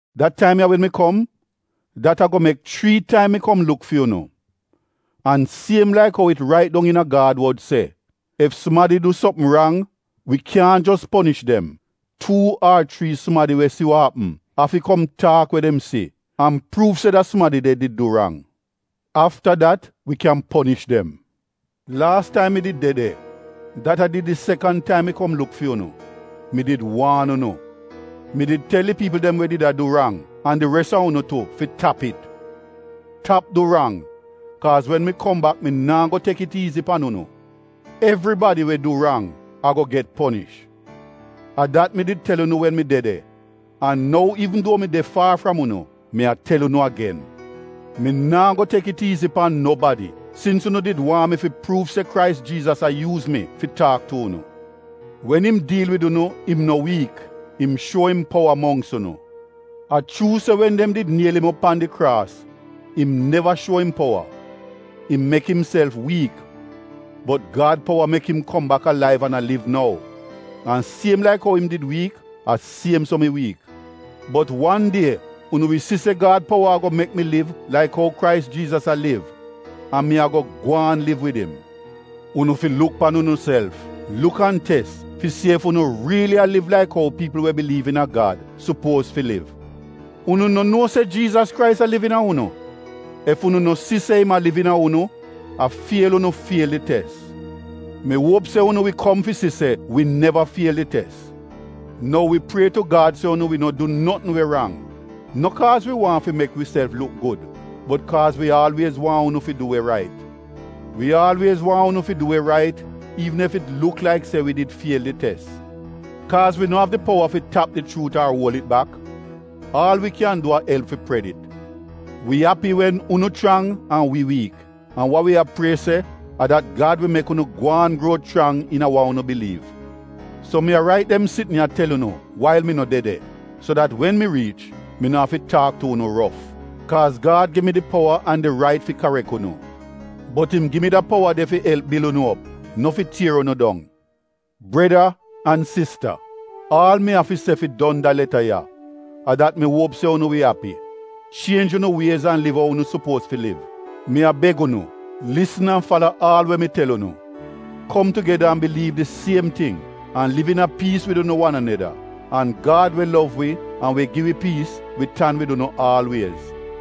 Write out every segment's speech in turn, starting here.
Da taim ya wen mi kom, dat ago mek chrii taim mi kom luk fi unu. An siem laik ou it rait dong iina Gad wod se, “Ef sumadi du sopm rang, wi kyaahn jos ponish dem, tuu ar chrii sumadi we si wa apm, afi kom taak we dem si an pruuv se da sumadi de did du rang. Afta dat we kyan ponish dem.” Laas taim mi did de de, dat a did di sekan taim mi kom luk fi yu, mi did waan unu. Mi did tel di piipl dem we did a du rang, an di res a unu tu fi tap it. Tap du rang kaaz wen mi kom bak mi naa go tek it iizi pan unu. Evribadi we du rang ago get ponish. A dat mi did tel unu wen mi de de an nou iivn duo mi de faar fram unu, mi a tel unu agen. Mi naa go tek it iizi pan nobadi sins unu did waahn mi fi pruuv se Krais Jiizas a yuuz mi fi taak tu unu. Wen im diil wid unu im no wiik, im shuo im powa mongks unu. A chuu se, wen dem did niel im op pan di kraas, im neva shuo im powa — im mek imself wiik, bot Gad powa mek im kom bak alaiv an a liv nou. An siem laik ou fi im did wiik a siem so mi wiik, bot wan die unu wi si se Gad powa ago mek mi liv laik ou Krais Jiizas a liv an mi ago gwaan liv wid im. Unu fi luk pan unuself. Luk an tes fi si ef unu riili a liv laik ou piipl we biliiv iina Gad sopuoz fi liv. Unu no nuo se Jiizas Krais a liv iina unu? Ef unu no si se im a liv iina unu a fiel unu fiel di tes. Mi uop se unu wi kom fi si se wi neva fiel di tes. Nou wi prie tu Gad se unu wi no du notn we rang, no kaaz wi waahn fi mek wiself luk gud bot kaaz wi aalwiez waahn unu fi du we rait. Wi aalwiez waahn unu fi du we rait iivn ef it luk laik se wi did fiel di tes. Kaaz wi no av di powa fi tap di chuut ar uol it bak. Aal wi kyan du a elp fi pred it. Wi api wen unu chrang an wi wiik an wa wi a prie se, a dat Gad wi mek unu gwaan gruo chrang iina wa unu biliiv. So mi a rait dem sitn ya tel unu wail mi no de de, so dat wen mi riich, mi no afi taak tu unu rof. Kaaz Gad gi mi di powa an di rait fi karek unu, bot im gi mi da powa de fi elp bil unu op, no fi tier unu dong. Breda an sista, aal mi av fi se fi don da leta ya a dat mi uop se unu wi api. Chienj unu wiez an liv ou unu sopuoz fi liv. Mi a beg unu lisn an fala aal we mi tel unu. Kom tugeda an biliiv di siem ting an liv iina piis wid unu wan aneda. An Gad we lov wi an we gi wi piis wi tan wid unu aalwiez.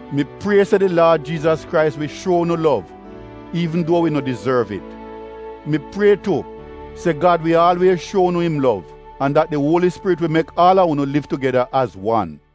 Mi prie se di Laad Jiizas Krais wi shuo unu lov iivn duo wi no dizorv it. Mi prie tu se Gad wi aalwiez shuo unu im lov an dat di Uoli Spirit wi mek aal a unu liv tugeda az wan.